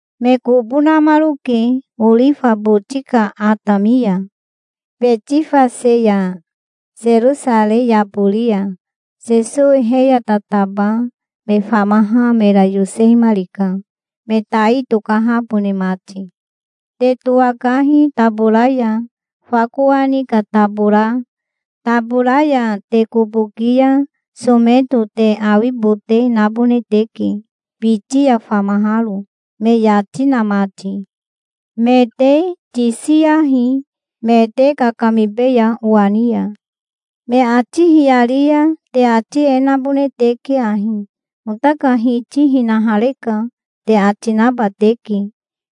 Me kobo namaroke orifa boti ka atami ya, Betifase ya, Serosarei yabori ya. Sesowi he ya tataba me famaha mera yosehimarika, me tai tokahabone mati. "Te towakahi tabora ya, fa kowani ka tabora. Tabora ya te kobo ki ya someto te awibote nabone teke, biti ya famaharo, me yati na mati. Me te tisiyahi, me te kakamibeya owa ni ya. Me ati hiyari ya te ati e nabone teke ahi: 'Ota ka Hiti hinahareka', te ati naba teke.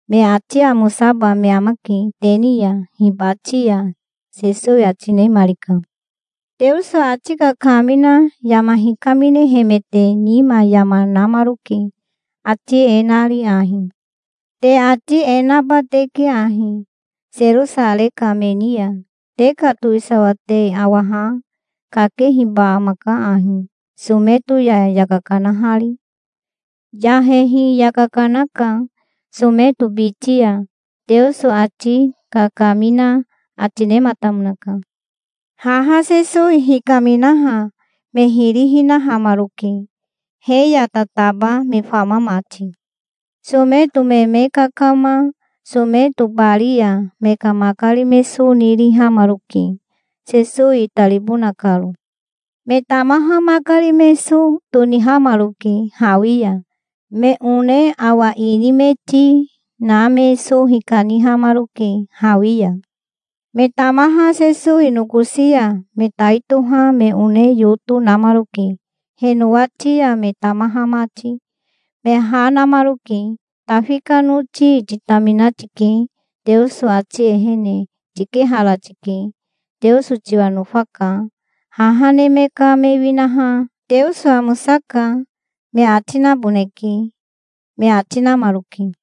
Me ati amosaba me amake te ni ya hibati ya", Sesowi ati nemarika. Teoso ati kakamina yama hikaminehemete nima yama namaroke, ati e nari ahi: "Te ati e naba teke ahi, Serosarei ka me ni ya: 'Te ka towisawa te awa ha. Kakehiba amaka ahi, someto ya yaka kanahari. Yahehi yaka kanaka someto biti ya,'" Teoso ati kakamina ati nematamonaka. Haha Sesowi hikaminaha me hiri hinahamaroke, he ya tataba me fama mati. Someto me me kakama someto bari ya me ka makari me so nirihamaroke, Sesowi itaribona karo. Me tamaha makari me so tonihamaroke hawi ya. Me one awa ini me ti na me so hikanihamaroke hawi ya. Me tamaha Sesowi nokosi ya me tai toha me one yoto namaroke he nowati ya, me tamaha mati. Me ha namaroke. "Tafi ka noti titamina tike. Teoso ati ehene tikehara tike. Teoso tiwa nofaka. Haha neme ka me winaha 'Teoso amosaka', me ati naboneke", me ati namaroke.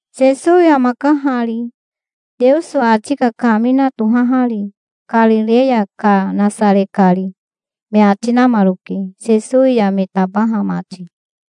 "Sesowi amaka hari, Teoso ati kakamina tohahari, Karireya ka Nasare kari", me ati namaroke, Sesowi ya me tabaha mati.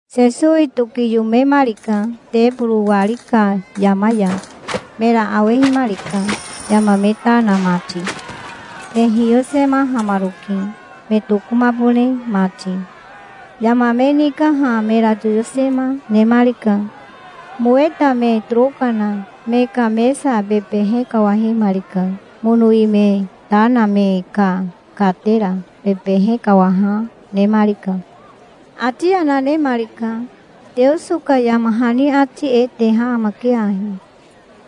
Sesowi tokiyomemarika teboro wari ka yama ya. Mera awehimarika, yama me ta na mati. Me hiyosemahamaroke, me tokomabone mati. Yama me nikaha mera toyosema nemarika. Moweta me toroka na me ka mesa bebehe kawahemarika. Monowi me ta na me ka katera bebehe kawaha nemarika. Ati yana nemarika. "Teoso ka yama hani ati e teha amake ahi: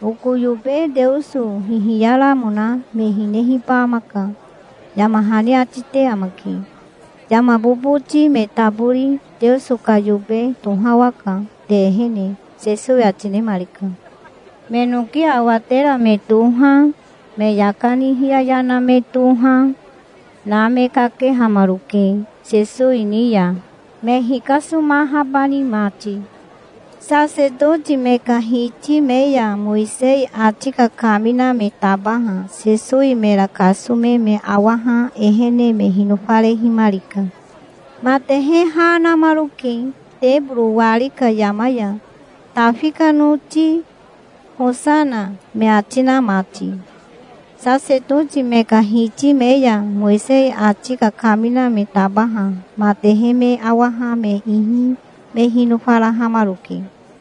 'Oko yobe Teoso hihiyaramona me hinehiba amaka', yama hani ati te amake. Yama boboti me tabori Teoso ka yobe tohawaka te ehene", Sesowi ati nemarika. Me noki awatera me toha, me yaka ni hiyaya na me toha, na me kakehamaroke Sesowi ni ya, me hikasomahabani mati. Sasetoti me ka hiti me ya Mowisei ati kakamina me tabaha Sesowi mera kasome me awaha ehene me hinofarehimarika. Matehe ha namaroke teboro wari ka yama ya, "Tafi ka noti hosana", me ati na mati. Sasetoti me ka hiti me ya Mowisei ati kakamina me tabaha matehe me awaha me ihi me hinofarahamaroke.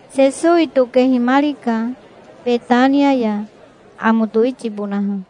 Sesowi tokehimarika Betania ya, amo towitibonaha.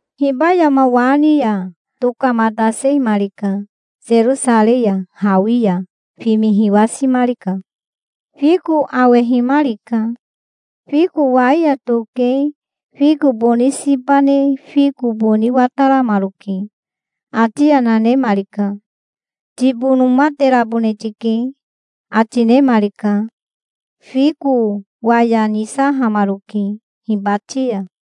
Hiba yama wa ni ya tokamatasehimarika Serosarei ya. Hawi ya fimi hiwasimarika. Fiko awehimarika. Fiko wai ya toke fiko boni siba ne fiko boni wataramaroke. Ati yana nemarika. "Tibonomaterabone tike", ati nemarika. Fiko waya nisahamaroke hibati ya.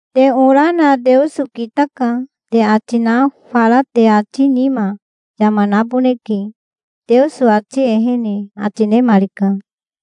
Te ora na 'Teoso kitaka', te ati na fara te ati nima yama naboneke, Teoso ati ehene", ati nemarika.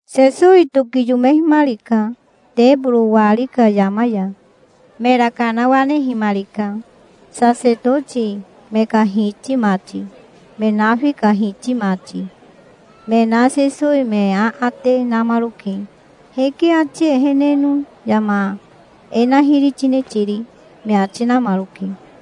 Sesowi tokiyomehimarika teboro wari ka yama ya. Mera kanawanehimarika. Sasetoti me ka hiti mati, me nafi ka hiti mati, me na Sesowi me aate namaroke. "Hike ati eheneno yama e na hiri tine tiri?" me ati namaroke.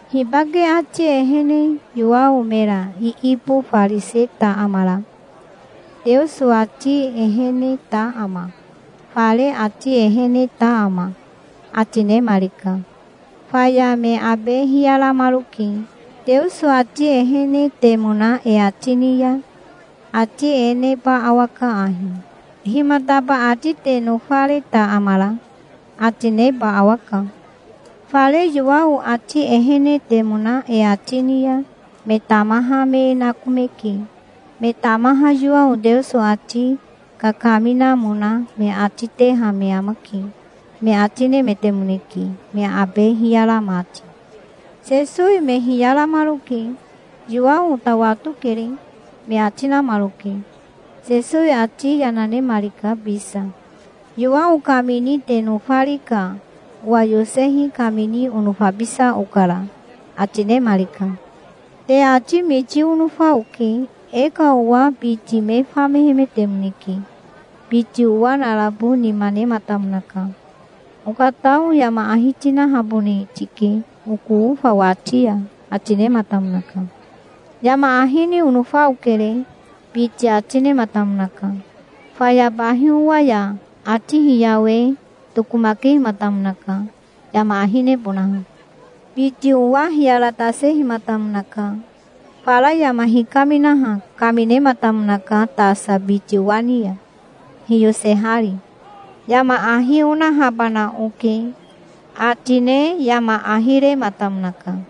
Hibake ati ehene Yowao mera iibofariseta amara? Teoso ati eheneta ama? Fare ati eheneta ama?" ati nemarika. Faya me abe hiyaramaroke. "Teoso ati ehenetemona e ati ni ya ati e neba awaka ahi: 'Himataba ati te nofareta amara?' ati neba awaka. Fare Yowao ati ehenetemona e ati ni ya me tamaha me e nakomeke. Me tamaha Yowao Teoso ati kakaminamona me ati teha me amake", me ati nemetemoneke, me abe hiyara mati. Sesowi me hiyaramaroke. "Yowao ota watokere", me ati namaroke. Sesowi ati yana nemarika bisa. "Yowao kamini te nofari ka owa yosehi kamini onofabisa okara", ati nemarika. "Te ati miti onofa oke. E ka owa biti me famehemetemoneke. Biti owa narabo nima nematamonaka. 'Okatao yama ahi tinahabone tike oko ofa wati ya', ati nematamonaka". "'Yama ahi ni onofa okere', biti ati nematamonaka. Faya bahi owa ya ati hiyawe tokomakehimatamonaka, yama ahi nebonaha". "Biti owa hiyaratasehimatamonaka. Fara yama hikaminaha kaminematamonaka tasa biti owa ni ya, hiyosehari. 'Yama ahi onahabana oke', ati ne yama ahi rematamonaka".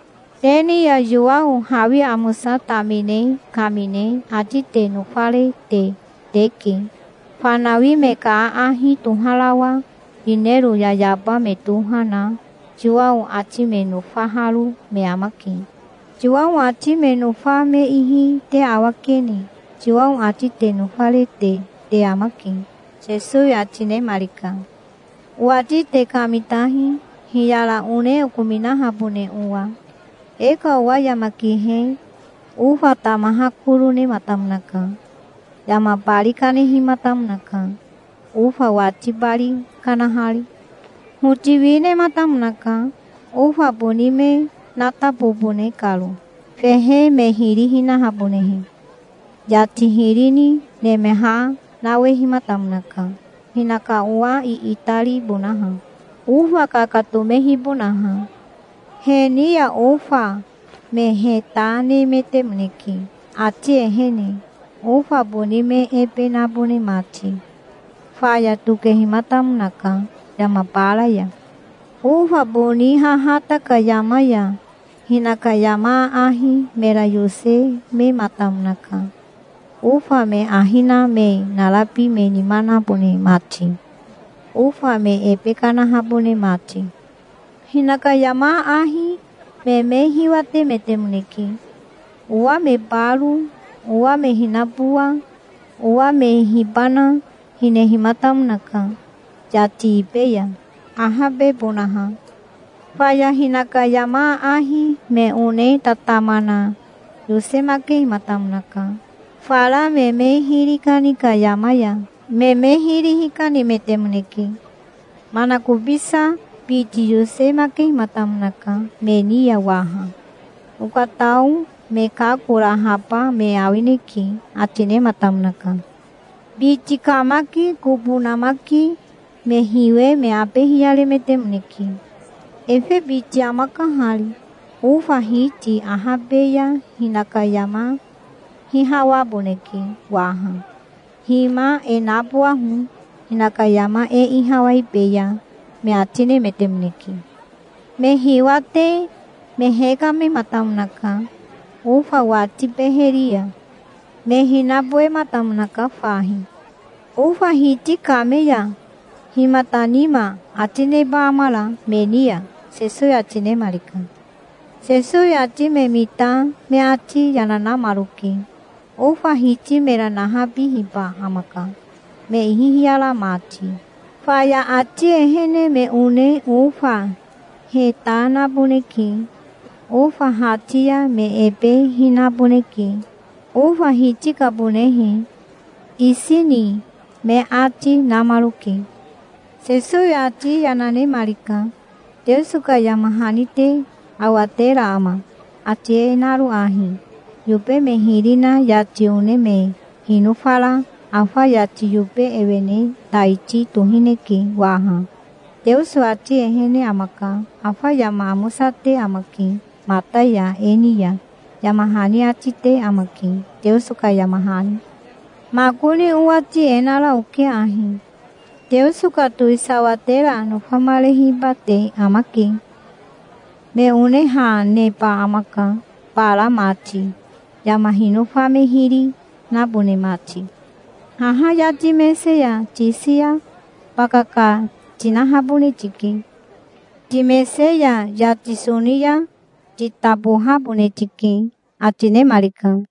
Te ni ya Yowao hawi amosa tamine kamine ati te nofarete teke. Fanawi me ka aahi toharawa yinero yayaba me toha na Yowao ati me nofaharo me amake. Yowao ati me nofa me ihi te awakene Yowao ati te nofarete te amake", Sesowi ati nemarika. "Owati te kamitahi, hiyara one okominahabone owa. E ka owa yama kihe ofa tamaha koro nematamonaka. Yama bari kanehimatamonaka, ofa wati bari kanahari. Hoti wi nematamonaka, ofa boni me natabobone karo, fehe me hiri hinahabonehe. Yati hiri ni nemeha nawehimatamonaka, hinaka owa iitaribonaha, ofa kakatomehibonaha. He ni ya ofa me heta nemetemoneke ati ehene, ofa boni me ebe nabone mati. Faya tokehimatamonaka yama bara ya". "Ofa boni hahata ka yama ya hinaka yama aahi mera yosemematamonaka, ofa me ahi na me narabi me nima nabone mati, ofa me ebe kanahabone mati". "Hinaka yama aahi me me hiwatemetemoneke. Owa me baro, owa me hinabowa, owa me hibana, hinehimatamonaka yati ibe ya, ahabebonaha". "Faya hinaka yama aahi me one tatama na yosemakehimatamonaka. Fara me me hiri kani ka yama ya me me hiri hikanemetemoneke". "Manakobisa biti yosemakehimatamonaka me ni ya waha. 'Okatao me kakorahaba me awineke', ati nematamonaka". "Biti kamaki kobo namaki me hiwe me abe hiyaremetemoneke. 'Efe biti amaka hari. Ofa hiti ahabe ya hinaka yama hihawaboneke waha. Hima e nabowaho. Hinaka yama e ihawaibeya', me ati nemetemoneke. Me hiwate me hekamematamonaka ofa wati beheri ya. Me hinabowematamonaka fahi". "Ofa hiti kame ya himata nima ati neba amara me ni ya?" Sesowi ati nemarika. Sesowi ati me mita me ati yana namaroke. "Ofa hiti mera nahabihiba amaka, me ihi hiyara mati. Faya ati ehene me one ofa heta naboneke. Ofa hati ya me ebe hinaboneke, ofa hiti kabonehe, isi ni", me ati namaroke. Sesowi ati yana nemarika. "Teoso ka yama hani te awatera ama, ati e naro ahi: 'Yobe me hiri na yati one me hinofara afa yati yobe ewene taiti tohineke waha. Teoso ati ehene amaka. Afa yama amosate amake mata ya e ni ya', yama hani ati te amake, Teoso ka yama hani". "Makoni owati e nara oke ahi: Teoso ka towisawa tera nofamarehiba te amake. Me one ha neba amaka, bara mati, yama hinofa me hiri nabone mati. Haha yati mese ya tisi ya bakaka tinahabone tike. Timese ya yati soni ya titabohabone tike", ati nemarika.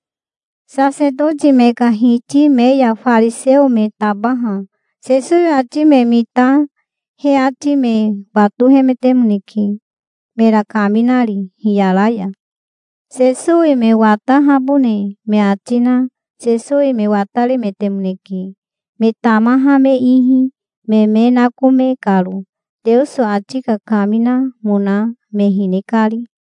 Sasetoti me ka hiti me ya fariseo me tabaha Sesowi ati me mita he ati me watohemetemoneke, mera kaminari hiyara ya. Sesowi me watahabone me ati na Sesowi me wataremetemoneke, me tamaha me ihi, me me nakome karo, Teoso ati kakaminamona me hine kari.